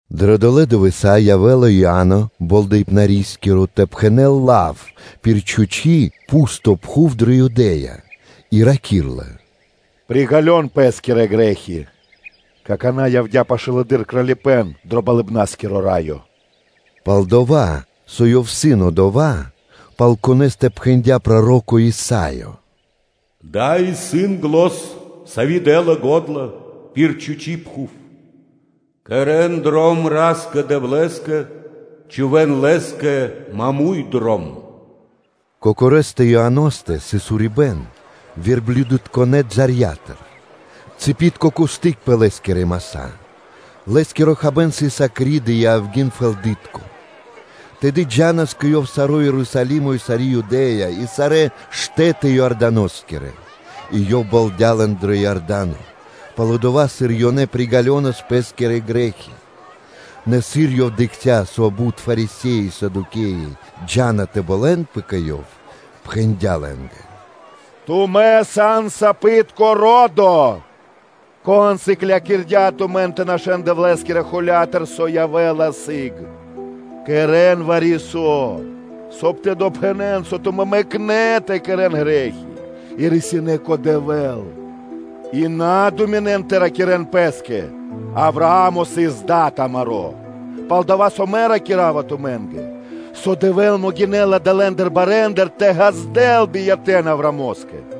Дрэ долэ́ дывэса́ явэ́ла Иа́но Болдэипнари тэ пхэнэ́л лав пир чхучи́ (пусто) пхув дрэ Юдэ́я, и раки́рла: “Приґалён пэ́скирэ грэ́хи (бизы), какана́ явдя́ пашылэды́р Кралипэ́н дро Болыбна́скиро Раё.” Пал-дова́ со ёв исын одова́, пал конэ́стэ пхэндя́ проро́ко Исаё: “Дава́ исын зан, сави́ дэ́ла го́дла пир чхучи́ пхув: ‘Кэрэ́н дром Ра́скэ-Дэвлэ́скэ, чхувэ́н Лэ́скэ маму́й (пря́мо) дром.’” Кокорэстэ Ианостэ сыс урибэ́н верблюдытконэ балэндыр; цыпитко кусты́к пэ лэ́скирэ маса́; лэ́скиро хабэ́н сыс акриды и авги́н (мэда) фэлдытко. Тэды джа́нас кэ ёв саро́ Ерусалимо и сари́ Юдэ́я и сарэ́ штэ́ты Иорданоскирэ, и ёв болдя лэн дро Иорда́но, пало́ дова́, сыр ёнэ приґалёнас пэ́скирэ грэ́хи. Нэ сыр ёв дыкхця́, со бут Фарисе́и и Садукеи джа́нас тэ болэнпэ кэ ёв, пхэндя́ лэ́нгэ: “Тумэ́ сан сапитко ро́до! Кон сыклякирдя́ тумэн тэ нашэ́н Дэвлэ́скирэ холя́тыр, со явэ́ла сыг? Кэрэ́н вари-со, соб (кай) тэ допхэнэн, со тумэ́ мэкнэ́ тэ кэрэ́н грэ́хи и рисинэ́ кэ Дэвэ́л. И на думинэн тэ ракирэ́н пэ́скэ: ‘Авраа́мо сыс дад амаро́;’ пал-дова́ со мэ ракира́ва тумэ́нгэ, со Дэвэ́л могинэ́ла далэндыр барэндыр тэ ґаздэл биятэ́н Авраамо́скэ.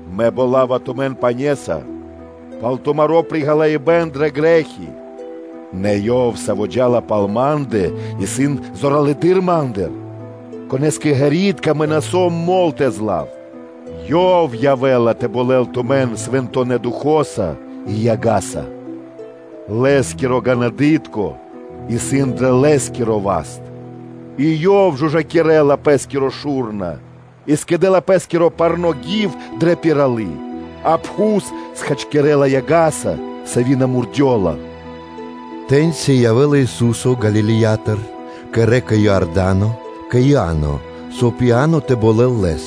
Мэ болава тумэн пане́са пал тумаро́ при ґалыибэ́н дрэ грэ́хи, нэ Ёв, Саво́ джа́ла пал ма́ндэ, исын зоралэды́р ма́ндыр, Конэ́скэ ґэритка мэ на сом мол тэ злав; Ёв явэ́ла тэ болэл тумэн Свэнтонэ́ Духо́са (Фаноса) и яга́са. Лэ́скиро ґанадытко (лопата) исын дрэ Лэ́скиро васт, и Ёв жужакирэла (чыстинэла) Пэ́скиро шу́рна и скэдэ́ла Пэ́скиро парно́ гив дрэ пиралы́, а пхус хачкирэ́ла яга́са, сави́ на мурдёла.” Тэ́ньци явэ́ла Ису́со Галилеятыр кэ рэка (лэнь) Иорда́но кэ Иа́но, соб (кай) Иа́но тэ болэл Лэс.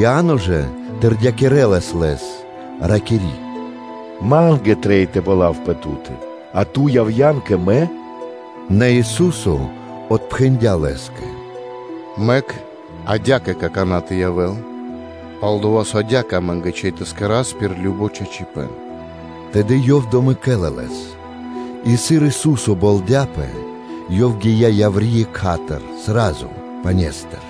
Иа́но жа тэрдякирэлас Лэс, ракири́: “Ма́нгэ трэй тэ болавпэ Ту́тэ, а Ту явэ́са кэ мэ?” Нэ Ису́со отпхэндя́ лэ́скэ: “Мэк адя́кэ какана́ тэ явэ́л; пал-дова́ со адя́кэ амэ́нгэ трэй тэ кэра́с пир кажно чачипэ́н.” Тэды ёв домэкэла Лэс. И сыр Ису́со болдяпэ, Ёв гия́ яври́ екха́тыр (сра́зу) пане́стыр,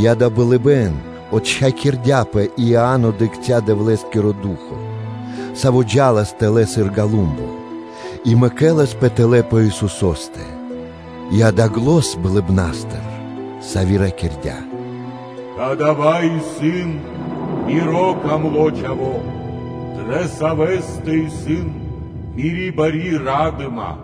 и, акэ, болыбэ́н псирадыя (отчхакирдяпэ), и Иа́но дыкхця́ Дэвлэ́скиро Ду́хо (Фа́но), Саво́ джа́лас тэлэ́ сыр голумбо, и мэкэласпэ тэлэ́ пэ Исусо́стэ; И акэ, зан болыбна́стыр, сави́ ракирдя́: “Кадава́ исын Миро дро́го Чхаво́, дрэ Савэ́стэ исын Мири́ бари ра́дыма.”